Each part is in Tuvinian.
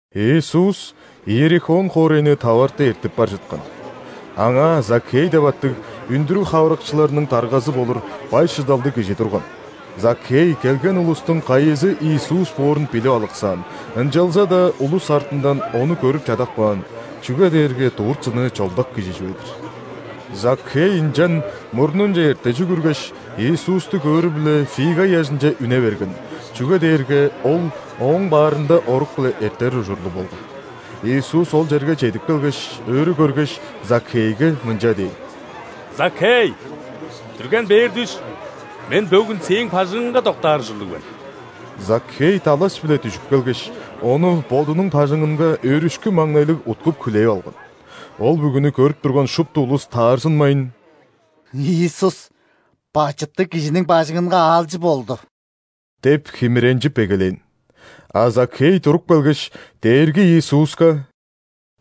Иисус Иерихон хоорайны таварты эртип бар чыткан. Аңаа Закхей деп аттыг, үндүрүг хавырыкчыларының даргазы болур бай-шыдалдыг кижи турган. Закхей келген улустуң кайызы Иисус боорун билип алыксаан, ынчалза-даа улус артындан Ону көрүп чадап каан, чүге дээрге дурт-сыны чолдак кижи чүве-дир. Закхей ынчан мурнунче эрте чүгүргеш, Иисусту көөрү-биле фига ыяжынче үне берген, чүге дээрге Ол ооң баарында орук-биле эртер ужурлуг болган. Иисус ол черге чедип келгеш, өрү көргеш, Закхейге мынча дээн: «Закхей, дүрген бээр дүш, Мен бөгүн сээң бажыңыңга доктаар ужурлуг мен». Закхей далаш-биле дүжүп келгеш, Ону бодунуң бажыңынга өөрүшкү-маңнайлыг уткуп-хүлээп алган. Ол бүгүнү көрүп турган шупту улус таарзынмайн: «Иисус бачыттыг кижиниң бажыңынга аалчы болду!» – деп химиренчип эгелээн. А Закхей туруп келгеш, Дээрги Иисуска: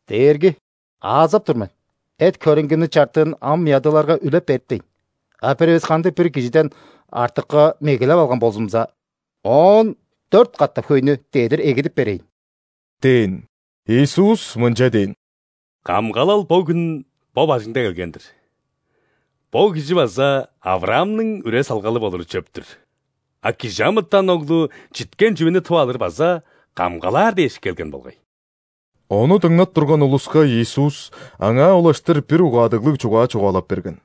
«Дээрги! Аазап тур мен: эт-хөреңгимниң чартыын ам ядыыларга үлеп бериптейн, а бир эвес кандыг-бир кижиден артыкка мегелеп алган болзумза, оон дөрт катап хөйнү дедир эгидип берейн!» – дээн. Иисус мынча дээн: «Камгалал бөгүн бо бажыңда келген-дир; бо кижи база ·Авраамның үре-салгалы болуру чөп-түр! А ·Кижи амытан Оглу читкен чүвени тып алыр база камгалаар дээш келген болгай». Ону дыңнап турган улуска Иисус аңаа улаштыр бир угаадыглыг чугаа чугаалап берген.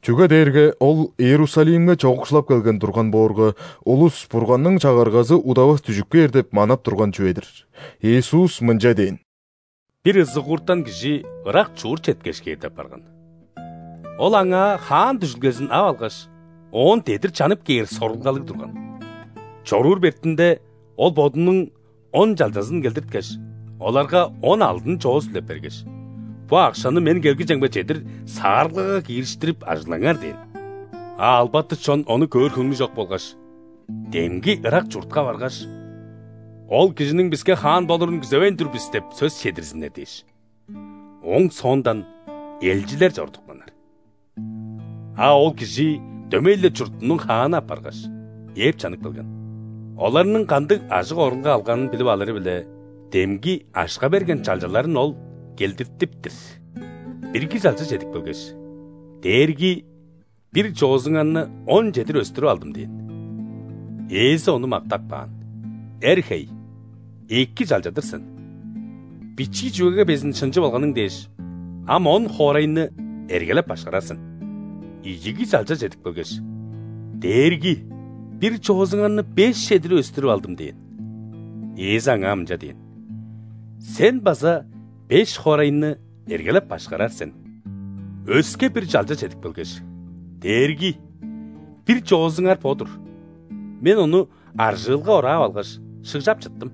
Чүге дээрге Ол Иерусалимге чоокшулап келген турган боорга, улус Бурганның Чагыргазы удавас дүжүп кээр деп манап турган чүве-дир. Иисус мынча дээн: «Бир ызыгууртан кижи ырак чурт четкеш кээр деп барган. Ол аңаа хаан дүжүлгезин ап алгаш, оон дедир чанып кээр сорулгалыг турган. Чоруур бетинде, ол бодунуң он чалчазын келдирткеш, оларга он алдын чоос үлеп бергеш: „Бо акшаны мен келгижемге чедир саарылгага киириштирип, ажыглаңар“ – дээн. А албаты чон ону көөр хөңнү чок болгаш, демги ырак чуртка баргаш: „Ол кижиниң биске хаан болурун күзевейн тур бис“ – деп сөс чедирзиннер дээш, ооң соондан элчилер чорудупканнар. А ол кижи дөмей-ле чуртунуң хааны апаргаш, ээп чанып келген. Оларның кандыг ажык-орулга алганын билип алыры-биле, демги акша берген чалчаларын ол келдиртип-тир. Бирги чалча чедип келгеш: „Дээрги, бир чоозуңарны он чедир өстүрүп алдым“ – дээн. Ээзи ону мактап каан: „Эр хей! Эки чалча-дыр сен. Бичии чүвеге безин шынчы болганың дээш, ам он хоорайны эргелеп-башкарар сен“. Ийиги чалча чедип келгеш: „Дээрги, бир чоозуңарны беш чедир өстүрүп алдым“ – дээн. Ээзи аңаа мынча дээн: „Сен база беш хоорайны эргелеп-башкарар сен“. Өске бир чалча чедип келгеш: „Дээрги, бир чоозуңар бо-дур, мен ону аржыылга ораап алгаш, шыгжап чыттым.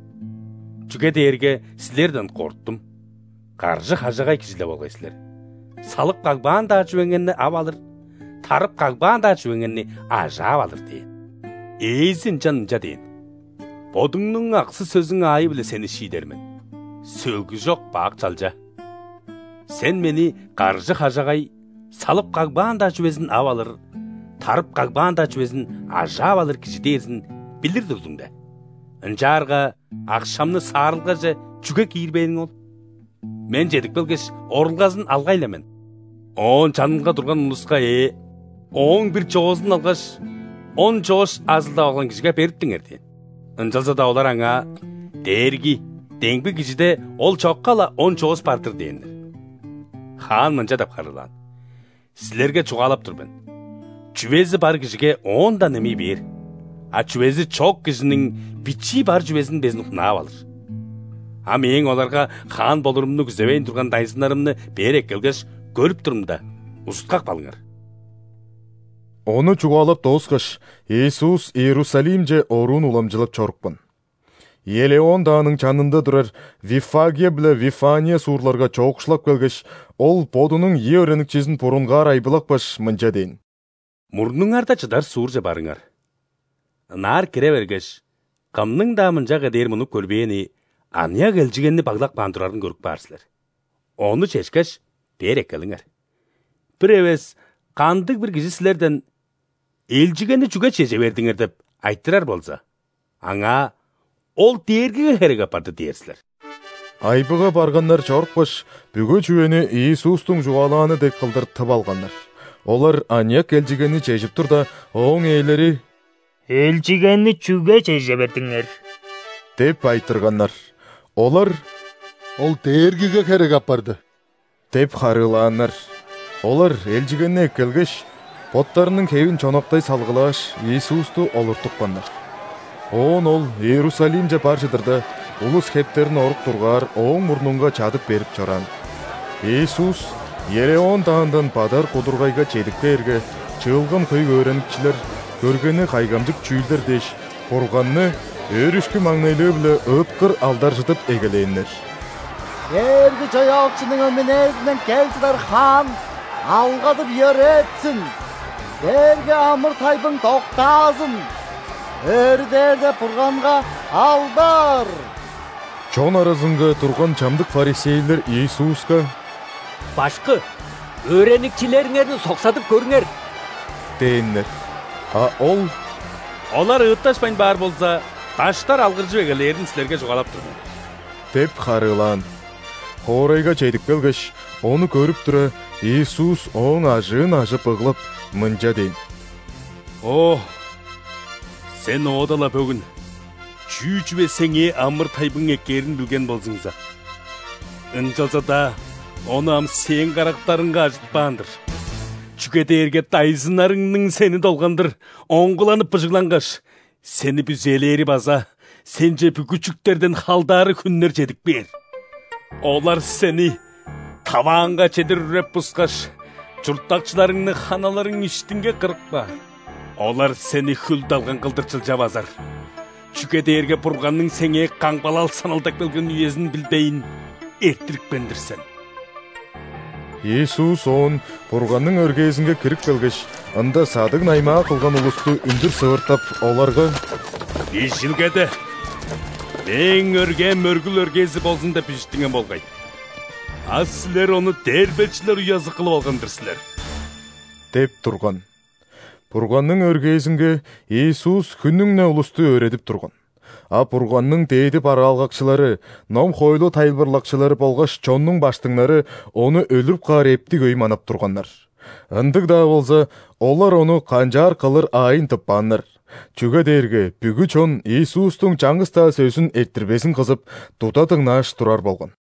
Чүге дээрге силерден корттум: каржы-хажагай кижи-ле болгай силер: салып кагбаан-даа чүвеңерни ап алыр, тарып кагбаан-даа чүвеңерни ажаап алыр“ – дээн. Ээзи ынчан мынча дээн: „Бодуңнуң аксы-сөзүң аайы-биле сени шиидер мен, сөлгүжок бак чалча! Сен мени каржы-хажагай, салып кагбаан-даа чүвезин ап алыр, тарып кагбаан-даа чүвезин ажаап алыр кижи дээрзин билир турдуң де?! Ынчаарга акшамны саарылгаже чүге киирбээниң ол? Мен чедип келгеш, орулгазын алгай-ла мен!“ Оон чанынга турган улуска ээ: „Ооң бир чоозун алгаш, он чоос ажылдап алган кижиге бериптиңер“ – дээн. Ынчалза-даа олар аңаа: „Дээрги, демги кижиде ол чокка-ла он чоос бар-дыр“ – дээннер. Хаан мынча деп харыылаан: „Силерге чугаалап тур мен: чүвези бар кижиге оон-даа немей бээр, а чүвези чок кижиниң бичии бар чүвезин безин хунаап алыр. А мээң оларга хаан болурумну күзевейн турган дайзыннарымны бээр эккелгеш, көрүп турумда, узуткап калыңар“». Ону чугаалап дооскаш, Иисус Иерусалимче оруун уламчылап чорупкан. Елеон дааның чанында турар Виффагия биле Вифания суурларга чоокшулап келгеш, Ол Бодунуң ийи өөреникчизин бурунгаар айбылапкаш, мынча дээн: «Мурнуңарда чыдар суурже барыңар. Ынаар кире бергеш, кымның-даа мынчага дээр мунуп көрбээни аныяк элчигенни баглап каан турарын көрүп каар силер. Ону чешкеш, бээр эккелиңер. Бир эвес кандыг-бир кижи силерден: „Элчигенни чүге чеже бердиңер?“ – деп айтырар болза, аңаа: „Ол Дээргиге херек апарды“ – дээр силер». Айбыга барганнар чорупкаш, бүгү чүвени Иисустуң чугаалааны дег кылдыр тып алганнар. Олар аныяк элчигенни чежип турда, ооң ээлери: «Элчигенни чүге чеже бердиңер?» – деп айтырганнар. Олар: «Ол Дээргиге херек апарды» – деп харыылааннар. Олар элчигенни эккелгеш, боттарының хевин чонактай салгылааш, Иисусту олуртупканнар. Оон Ол Иерусалимче бар чыдырда, улус хептерин орук дургаар Ооң мурнунга чадып берип чораан. Иисус Елеон даандан бадар кудургайга чедип кээрге, чыылган хөй өөреникчилер көргени кайгамчык чүүлдер дээш, Бурганны өөрүшкү-маңнайлыы-биле ыыткыр алдаржыдып эгелээннер: «Дээрги-Чаяакчының өмүнээзинден кел чыдар Хаан алгадып-йөрээтсин!Дээрге амыр-тайбың доктаазын, өрү дээрде Бурганга алдар!» Чон аразынга турган чамдык ·фарисейлер Иисуска: «Башкы, өөреникчилериңерни соксадып көрүңер!» – дээннер. А Ол: «Олар ыытташпайн баар болза, даштар алгыржып эгелээрин силерге чугаалап тур мен» – деп харыылаан. Хоорайга чедип келгеш, ону көрүп тура, Иисус ооң ажыын ажып ыглап, мынча дээн: «О, сен оода-ла бөгүн чүү чүве сеңээ амыр-тайбың эккээрин билген болзуңза! Ынчалза-даа ону ам сээң карактарыңга ажытпаан-дыр. Чүге дээрге дайзыннарыңның сени долгандыр оңгуланып-быжыглангаш, сени бүзээлээри база сенче бүгү чүктерден халдаары хүннер чедип кээр. Олар сени тавааңга чедир үреп-бускаш, чурттакчыларыңны ханаларың иштинге кырып каар. Олар сени хүл-далган кылдыр чылча базар, чүге дээрге Бурганның сеңээ камгалал саналдап келген үезин билбейн эрттирипкен-дир сен». Иисус оон Бурганның өргээзинге кирип келгеш, ында садыг-наймаа кылган улусту үндүр сывыртап, оларга: «Бижилгеде: „Мээң өргээм мөргүл өргээзи болзун“ – деп бижиттинген болгай, а силер ону дээрбечилер уязы кылып алган-дыр силер!» – деп турган. Бурганның өргээзинге Иисус хүннүң-не улусту өөредип турган. А Бурганның дээди бараалгакчылары, ном-хоойлу тайылбырлакчылары болгаш чоннуң ·баштыңнары Ону өлүрүп каар эптиг өй манап турганнар. Ындыг-даа болза, олар ону канчаар кылыр аайын тыппааннар, чүге дээрге бүгү чон Иисустуң чаңгыс-даа сөзүн эрттирбезин кызып, туда дыңнааш турар болган.